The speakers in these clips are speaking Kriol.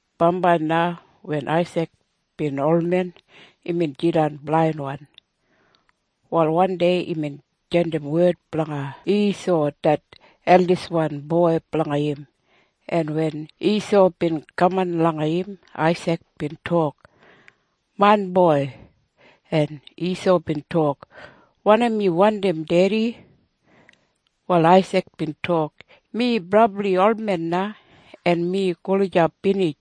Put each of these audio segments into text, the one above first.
Bambai na wen Aisik bin olmen, imbin jidan blainwan. Wal wandei imbin jandim wed blanga Isau det eldiswan boi blanga im, en wen Isau bin kaman langa im, Aisik bin tok, “Main boi!” En Isau bin tok, “Wanim yu wandim, Dedi?” Wal Aisik bin tok, “Mi brabli olmen na, en mi gulijap binij.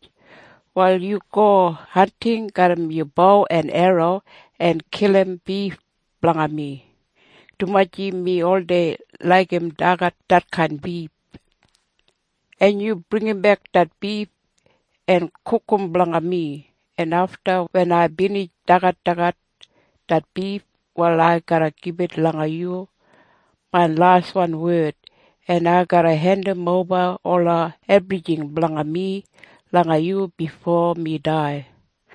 Wal yu go hanting garram yu bo en erro en kilim bif blanga mi, dumaji mi oldei laigim dagat detkain bif. En yu bringimbek det bif en gugum blanga mi, en afta wen ai binij dagadagat det bif, wal ai garra gibit langa yu main laswan wed, en ai garra hendimoba ola ebrijing blanga mi langa yu bifo mi dai.”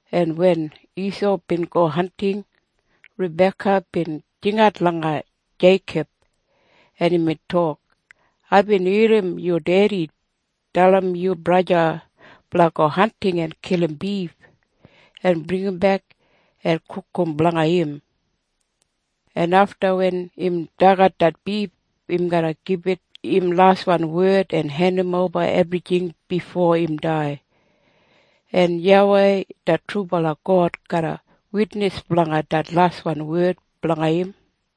en wen Isau bin go hanting, Rabeka bin jingat langa Jeikob, en imbin tok, “Aibin irrim yu dedi dalim yu braja blanga go hanting en kilim bif en bringimbek en gugum blanga im, en afta wen im dagat det bif, im garra gibit im laswan wed en hendimoba ebrijing bifo im dai. En YAWEI det trubala God garra witnis blanga det laswan wed blanga im.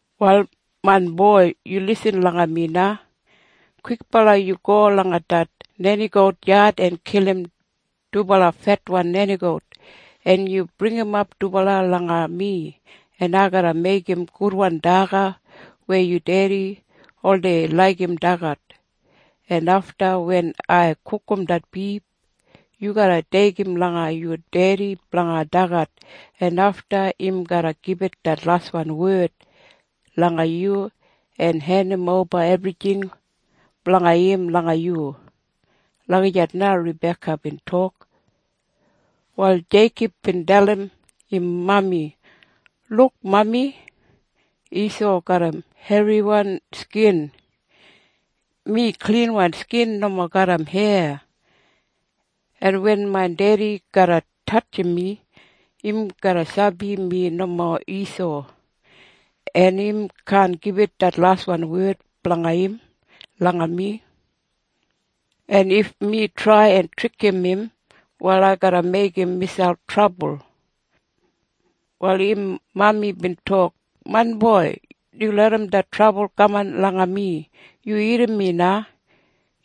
“Wal main boi, yu lisin langa mi na. Kwikbala yu go langa det nenigout yad en kilim dubala fetwan nenigout, en yu bringimap dubala langa mi, en ai garra meigim gudwan daga weya yu dedi oldei laigim dagat, en afta wen ai gugum det bif, yu garra deigim langa yu dedi blanga dagat, en afta im garra gibit det laswan wed langa yu en hendimoba ebrijing blanga im langa yu.” Lagijat na Rabeka bin tok. Wal Jeikob bin dalim im mami, “Luk, mami. Isau garram herriwan skin. Mi klinwan skin nomo garram heya. En wen main dedi garra tatjim mi, im garra sabi mi nomo Isau, en im kaan gibit det laswan wed blanga im langa mi. En if mi trai en trikim im, wal ai garra meigim miselp trabul.” Wal im mami bin tok, “Main boi, yu larram det trabul kaman langa mi. Yu irrim mi na.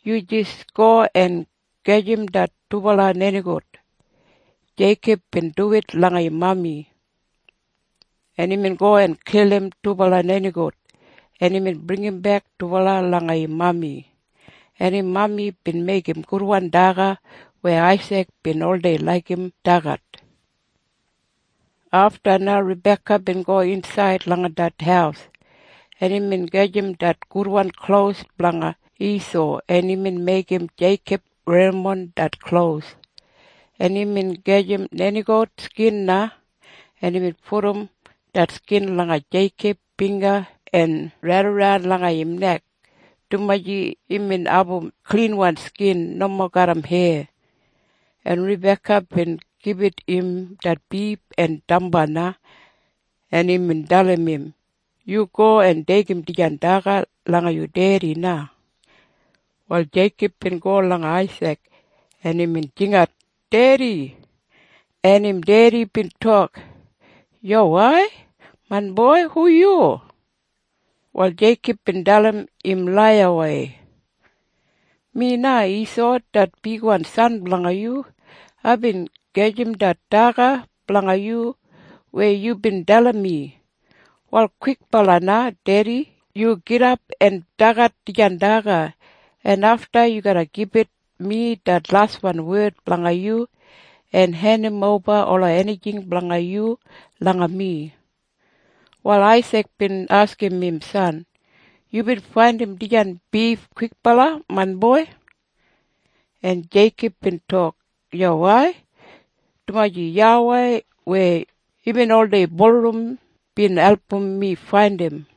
Yu jis go en gajim det dubala nenigout.” Jeikob bin duwit langa im mami, en imbin go en kilim dubala nenigout, en imbin bringimbek dubala langa im mami, en im mami bin meigim gudwan daga weya Aisik bin oldei laigim dagat. Afta na Rabeka bin go insaid langa det haus, en imbin gajim det gudwan klos blanga Isau, en imbin meigim Jeikob werrimon det klos, en imbin gajim nenigout skin na, en imbin pudum det skin langa Jeikob bingga en raidaran langa im nek, dumaji imbin abum klinwan skin nomo garram heya. En Rabeka bin gibit im det bif en damba na, en imbin dalim im, “Yu go en deigim dijan daga langa yu dedi na.” Wal Jeikob bin go langa Aisik, en imbin jingat, “Dedi!” En im dedi bin tok, “Yuwai, main boi. Hu yu?” Wal Jeikob bin dalim im laiyawei, “Mi na Isau det bigwan san blanga yu. Aibin gajim det daga blanga yu weya yubin dalim mi. Wal kwikbala na, dedi, yu gidap en dagat dijan daga, en afta yu garra gibit mi det laswan wed blanga yu en hendimoba ola enijing blanga yu langa mi.” Wal Aisik bin askim im san, “Yubin faindim dijan bif kwikbala, main boi.” En Jeikob bin tok, “Yuwai. Dumaji YAWEI weya yubin oldei bulurrum bin album mi faindim.”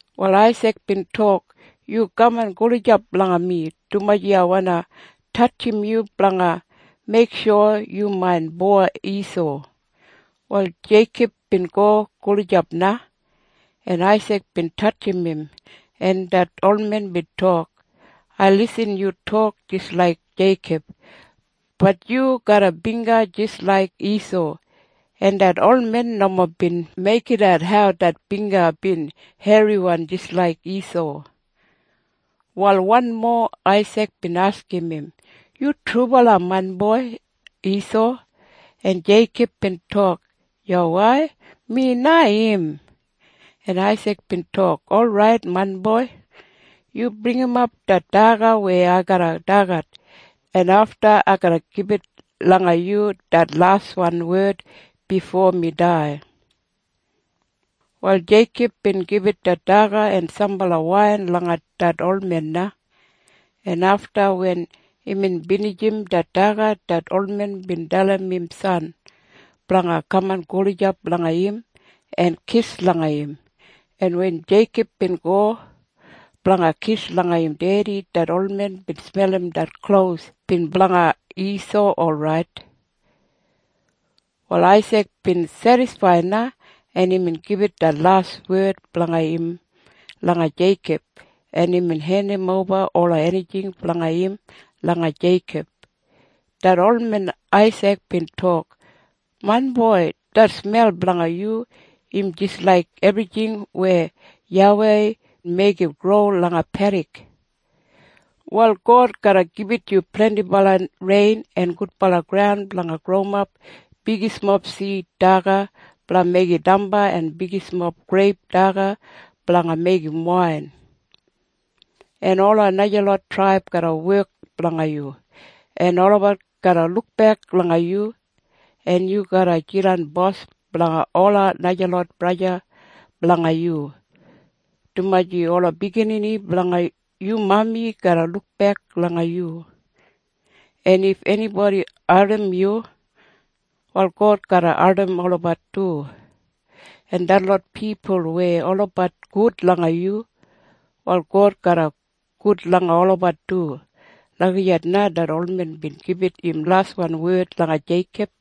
Wal Aisik bin tok, “Yu kaman gulijap langa mi, dumaji ai wandi tatjim yu blanga meiksho yu main boi Isau.” Wal Jeikob bin go gulijap na, en Aisik bin tatjim im, en det olmen bin tok, “Ai lisin yu tok jis laik Jeikob. Bat yu garram bingga jis laik Isau.” En det olmen nomo bin meigidat hau det bingga bin herriwan jis laik Isau. Wal wanmo Aisik bin askim im, “Yu trubala main boi Isau?” En Jeikob bin tok, “Yuwai. Mi na im.” En Aisik bin tok, “Orait, main boi. Yu bringimap det daga weya ai garra dagat, en afta ai garra gibit langa yu det laswan wed bifo mi dai.” Wal Jeikob bin gibit det daga en sambala wain langa det olmen na, en afta wen imbin binijim det daga, det olmen bin dalim im san blanga kaman gulijap langa im en kis langa im, en wen Jeikob bin go blanga kis langa im dedi, det olmen bin smelim det klos bin blanga Isau orait. Wal Aisik bin sedisfaid na, en imbin gibit det laswan wed blanga im langa Jeikob, en imbin hendimoba ola enijing blanga im langa Jeikob. Det olmen Aisik bin tok, “Main boi, det smel blanga yu im jis laik ebrijing weya YAWEI meigim gro langa pedik. Wal God garra gibit yu blendibala rein en gudbala graun blanga growimap bigismob sid daga blanga meigim damba en bigismob greip daga blanga meigim wain. En ola najalot traib garra wek blanga yu, en olabat garra lukbek langa yu. En yu garra jidan bos blanga ola najalot braja blanga yu, dumaji ola biginini blanga yu mami garra lukbek langa yu. En if enibodi ardim yu, wal God garra ardim olabat du. En detlot pipul weya olabat gud langa yu, wal God garra gud langa olabat du.” Lagijat na det olmen bin gibit im laswan wed langa Jeikob.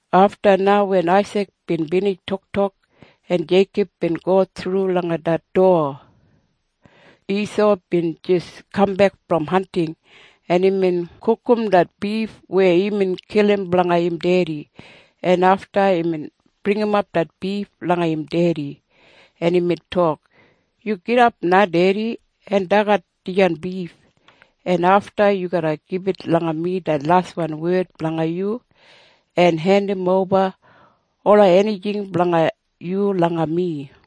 Afta na wen Aisik bin binij toktok en Jeikob bin go thru langa det dowa, Isau bin jis kambek brom hanting, en imbin gugum det bif weya imbin kilim blanga im dedi, en afta imbin bringimap det bif langa im dedi, en imbin tok, “Yu gidap na, dedi, en dagat dijan bif, en afta yu garra gibit langa mi det laswan wed blanga yu en hendimoba ola enijing blanga yu langa mi.”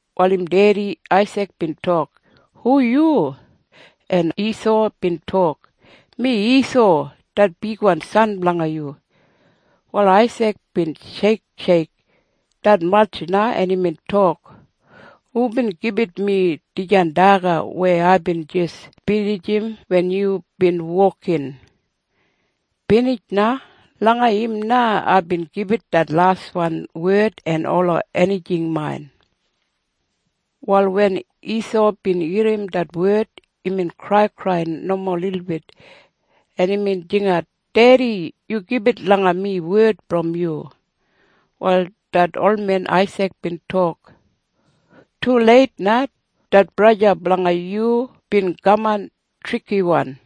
Wal im dedi Aisik bin tok, “Hu yu?” En Isau bin tok, “Mi Isau, det bigwan san blanga yu.” Wal Aisik bin sheiksheik detmatj na, en imbin tok, “Hubin gibit mi dijan daga weya aibin jis binijim wen yubin wokin? Binij na. Langa im na aibin gibit det laswan wed en ola enijing main.” Wal wen Isau bin irrim det wed, imbin kraikrai nomo lilbit, en imbin jingat, “Dedi! Yu gibit langa mi wed brom yu!” Wal det olmen Aisik bin tok, “Tuleit na! Det braja blanga yu bin kaman trikiwan,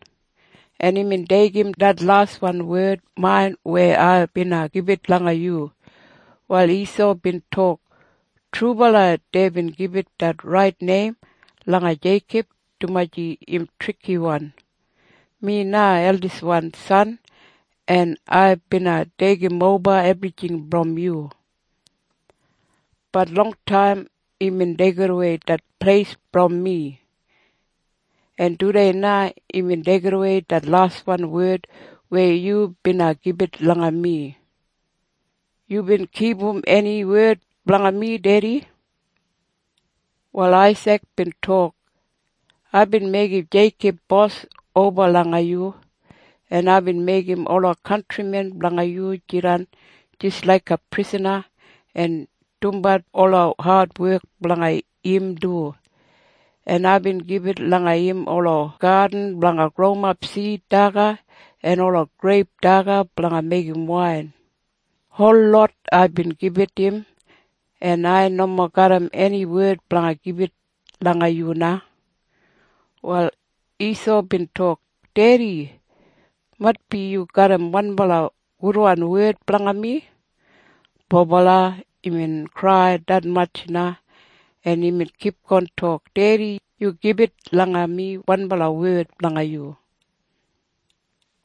en imbin deigim det laswan wed main weya ai bina gibit langa yu.” Wal Isau bin tok, “Trubala deibin gibit det rait neim langa Jeikob, dumaji im trikiwan. Mi na eldiswan san, en ai bina deigimoba ebrijing brom yu. Bat longtaim imbin deigidawei det pleis brom mi. En tudei na imbin deigidawei det laswan wed weya yu bina gibit langa mi. Yubin kipum eni wed blanga mi, dedi?” Wal Aisik bin tok, “Aibin meigim Jeikob bos oba langa yu, en aibin meigim ola kantrimen blanga yu jidan jis laiga prisana en dumbat ola adwek blanga im du. En aibin gibit langa im ola gadin blanga growimap sid daga en ola greip daga blanga meigim wain. Holot aibin gibit im. En ai nomo garram eni wed blanga gibit langa yu na.” Wal Isau bin tok, “Dedi, maitbi yu garram wanbala gudwan wed blanga mi.” Bobala, imbin krai detmatj na, en imbin kipgon tok, “Dedi, yu gibit langa mi wanbala wed blanga yu!”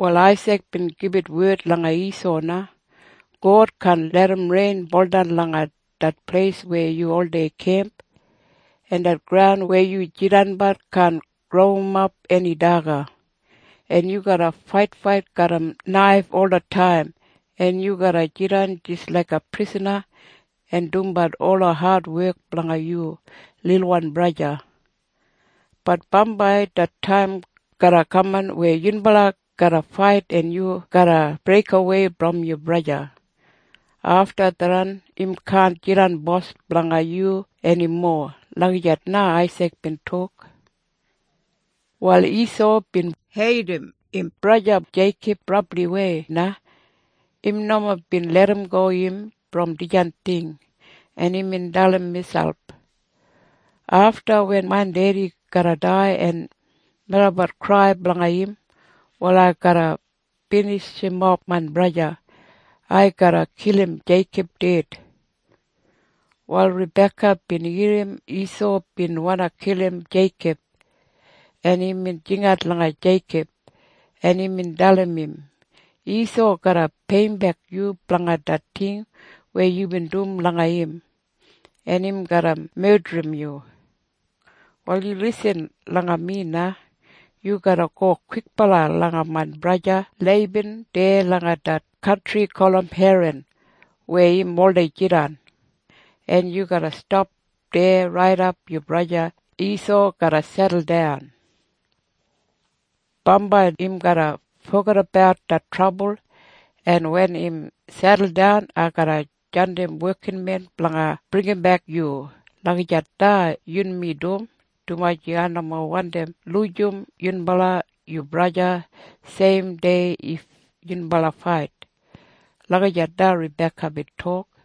Wal Aisik bin gibit wed langa Isau na, “God kaan larram rein buldan langa det pleis weya yu oldei kemp. En det graun weya yu jidanbat kaan growimap eni daga. En yu garra faitfait garram naif olataim, en yu garra jidan jis laiga prisana en dumbat ola adwek blanga yu lilwan braja. Bat bambai det taim garra kaman weya yunbala garra fait en yu garra breikawei brom yu braja. Afta tharran im kaan jidan bos blanga yu enimo.” Lagijat na Aisik bin tok. Wal Isau bin heidim im braja Jeikob brabliwei na. Im nomo bin larramgo im brom dijan ting, en imbin dalim miselp, “Afta wen main dedi garra dai en melabat krai blanga im, wal ai garra binijimof main braja. Ai garra kilim Jeikob ded.” Wal Rabeka bin irrim Isau bin wandi kilim Jeikob, en imbin jingat langa Jeikob, en imbin dalim im, “Isau garra peiyimbek yu blanga det ting weya yubin dum langa im, en im garra medrim yu. Wal yu lisin langa mi na. Yu garra go kwikbala langa main braja Leiban deya langa det kantri gulum Heran weya im oldei jidan, en yu garra stap deya raidap yu braja Isau garra seduldan. Bambai im garra fogedabat det trabul, en wen im seduldan, ai garra jandim wekinmen blanga bringimbek yu. Lagijat na yunmi dum, dumaji ai nomo wandi lujim yunbala yu braja seim dei if yunbala fait.” Lagijat na Rabeka bin tok.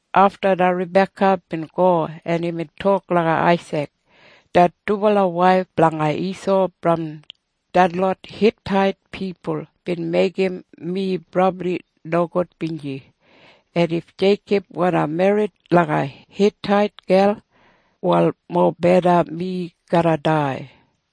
Afta na Rabeka bin go, en imbin tok langa Aisik, “Det dubala waif blanga Isau brom detlot Hitait pipul bin meigim mi brabli nogudbinji. En if Jeikob wandi merrit langa Hitait gel, wal mobeda mi garra dai.”